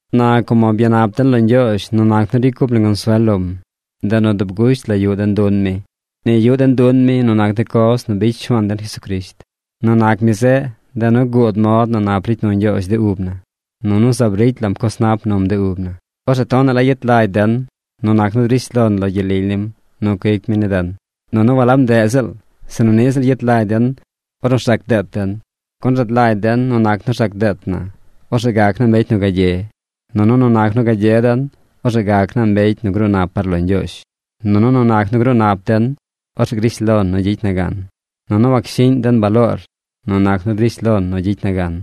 Na como byanap den lo Ñgyoozh nu nac nu ricy cup na consuel lom, ndeꞌ nu dub gusht la yuꞌ den dun mi. Ni yuꞌ den dun mi nu nac de coz nu bicy Shuaan den Jesucrisht. Nu nac mi zeꞌ, ndeꞌ nu guud mod nu nap ricy nu Ñgyoozh de ub na. Nunu zaab ricy lam coz nap num de ub na. Orzeꞌ tonaꞌ la yet lagy den nu nac nu drish lon lo gyel lily nim nu cuic mi ni den. Nunu walab ndeꞌ ziꞌl, sinu niꞌ ziꞌl yet lagy den ornu rzac deet den, gun rad lagy den nu nac nu rzac deet na, orzeꞌ gac naa mbecy nu gagye. Nunu nu nac nu gagye den, orzeꞌ gac naa mbecy nu gruu nap par lo Ñgyoozh. Nunu nu nac nu gruu nap den, orzeꞌ grish lon nu gyicy na gan. Nunu wacshiꞌñ den baloor nu nac nu drish lon nu gyicy na gan,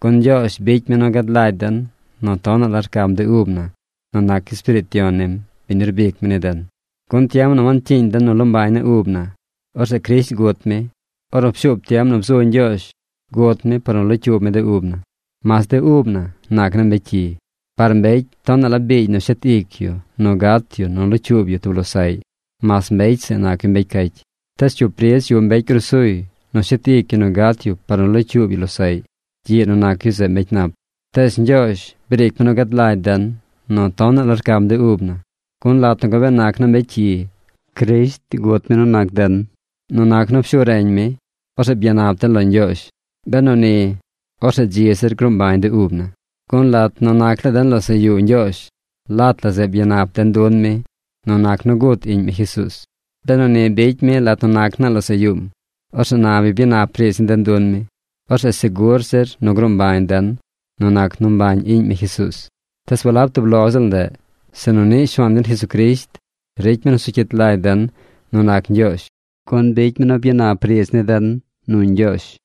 gun Ñgyoozh bicy mi nu gad lagy den nu tonaꞌ la rcam de ub na nu nac Espiriit Yon nim, biñ nu rbic mi ni den. Gun tiem nu wancyiiñ den nu loo mbañ naa ub na, orzeꞌ Crisht gut mi. Ornu pshuub tiem nu bzu Ñgyoozh, gut mi par nu locyuub mi de ub na, mas de ub na nac naa mbecy cyi. Par mbecy tonaꞌ la biigy nu shet ic yu nu gat yu nu locyuub yu tub losaꞌy mas mbecy zeꞌ nac yu mbecy cacy. Tees cyup ridz yuꞌ mbecy grusuy nu shet ic yu nu gat yu par nu locyuub yu losaꞌy gyiꞌ nu nac yu zeꞌ mbecy nap. Tees Ñgyoozh briic mi nu gad lagy den nu tonaꞌ la rcam de ub na, gun lat nu gabee nac naa mbecy cyi, Crisht gut mi nu nac den. Nu nac nu pshu reñ mi, orzeꞌ byanap den lo Ñgyoozh. Benu ni, orzeꞌ dzi zir gruu mbañ de ub na. Gun lat nu nac laa den losaꞌ yuu Ñgyoozh, lat la zeꞌ byanap den dun mi nu nac nu gut Iꞌñ mi Jesuuz. Benu ni bicy mi lat nu nac naa losaꞌ yuum, orzeꞌ na nu bi byanap riidz ni den dun mi, orzeꞌ segur zir nu gruu mbañ den nu nac nu mbañ Iꞌñ mi Jesuuz. Tees walab tub lo ziꞌl ndeꞌ, sinu niꞌ Shuaan den Jesucrisht ricy mi nu zu cyit lagy den nu nac Ñgyoozh, gun bicy mi nu byanap riidz ni den nu Ñgyoozh.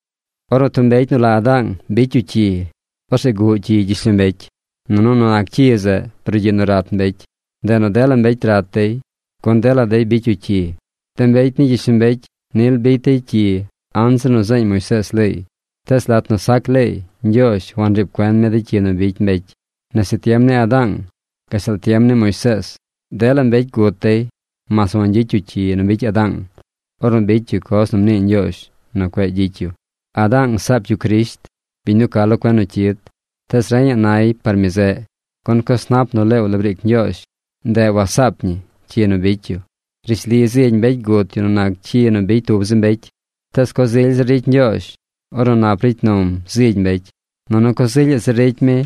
Ornu tub mbecy nu la Adaang bicy yu cyi, orzeꞌ guꞌ cyi gyishlombecy. Nunu nu nac cyi zeꞌ brugyiꞌ nu rat mbecy. Ndeꞌ nu dela mbecy rat dey, gun dela dey bicy yu cyi. De mbecy ni gyishlombecy nil bicy dey cyi anzir nu zeeñ Moisees leey. Tees lat nu sac leey Ñgyoozh wanriib cuen mi de cyi nu bicy mbecy. Nese tiem ni Adaang gashtal tiem ni Moisees, dela mbecy gut dey mas wangyicy yu cyi nu bicy Adaang ornu bicy yu coz nu mnii Ñgyoozh nu cueꞌ gyicy yu. Adaang saap yu Crisht, biñ nu ca lo cuen nu cyid. Tees reñaꞌ nay par mi zeꞌ. Gun coz nap nu leew la briic Ñgyoozh, ndeꞌ wasaap ñi cyi nu bicy yu. Rishli zigy mbecy gut yu nu nac cyi nu bicy tub zi mbecy. Tees coz ily zir ricy Ñgyoozh ornu nap ricy num zigy mbecy, nunu coz ilyaꞌ zir ricy mi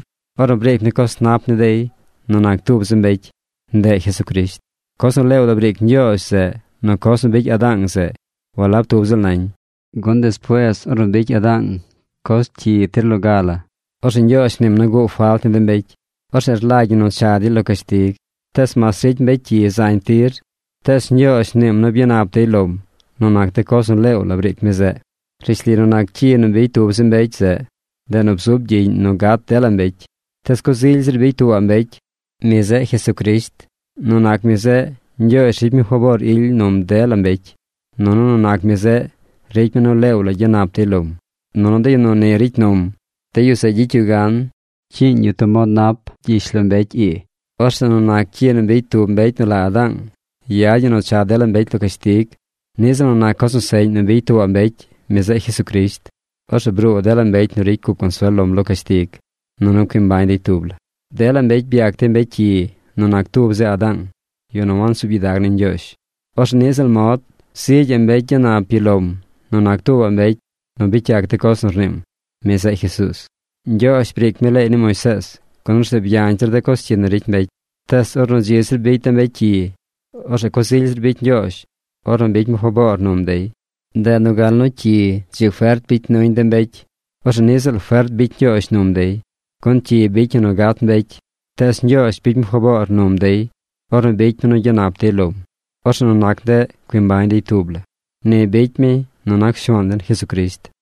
ornu briic mi coz nap ni dey nu nac tub zi mbecy. Ndeꞌ Jesucrisht. Coz nu leew la briic Ñgyoozh zeꞌ nu coz nu bicy Adaang zeꞌ, walab tub ziꞌl nañ. Gun despuees ornu bicy Adaang coz cyi tub tir, orzeꞌ Ñgyoozh mniim nu guꞌ falt ni de mbecy. Orzeꞌ rlagy ñi nu cha dey lo cashtig. Tees mas ricy mbecy cyi zañ tir, tees Ñgyoozh mniim nu byanap dey lom nu nac coz nu leew la briic mi zeꞌ. Rishli nu nac cyi nu bicy tub zi mbecy zeꞌ, ndeꞌ nu bzub gyiꞌñ nu gat dela mbecy. Tees coz ily zir bicy tuubaꞌ mbecy. Mi zeꞌ Jesucrisht. Nu nac mi zeꞌ Ñgyoozh ricy mi faboor ily num dela mbecy, nunu nu nac mi zeꞌ ricy mi nu leew la gyanap dey lom. Nunu de yu nu ni ricy num, de yu zeꞌ gyicy yu gan cyiiñ yu tub mod nap gyishlombecy ii. Orzeꞌ nu nac cyi nu bicy tub mbecy nu la Adaang, yad ñi nu cha dela mbecy lo cashtig. Niꞌ ziꞌl nu nac coz seꞌñ nu bicy tuubaꞌ mbecy, mi zeꞌ Jesucrisht, orzeꞌ bruu dela mbecy nu ricy cup consuel lom lo cashtig, nunu cui mbañ dey tub la. Dela mbecy byac dey mbecy cyi nu nac tub zi Adaang, yu nu wansuub gyidag ni Ñgyoozh. Orzeꞌ niꞌ ziꞌl mod, zigyaꞌ mbecy gyanap yu lom nu nac tuubaꞌ mbecy nu bicy yac de coz nu rniim. Mi zeꞌ Jesuuz. Ñgyoozh briic mi leey ni Moisees, gun orzeꞌ byañ zir de cyi nu ricy mbecy. Tees ornu dzi zir bicy de mbecy cyi, orzeꞌ coz ily zir bicy Ñgyoozh ornu bicy mi faboor num dey. Ndeꞌ nu gal nu cyi dzi fert bicy nuñ de mbecy, orzeꞌ niꞌ ziꞌl fert bicy Ñgyoozh num dey. Gun cyi bicy ñi nu gat mbecy. Tees Ñgyoozh bicy mi faboor num dey ornu bicy mi nu gyanap dey lom. Orzeꞌ nu nac ndeꞌ cui mbañ dey tub la. Ni bicy mi nu nac Shuaan den Jesucrisht.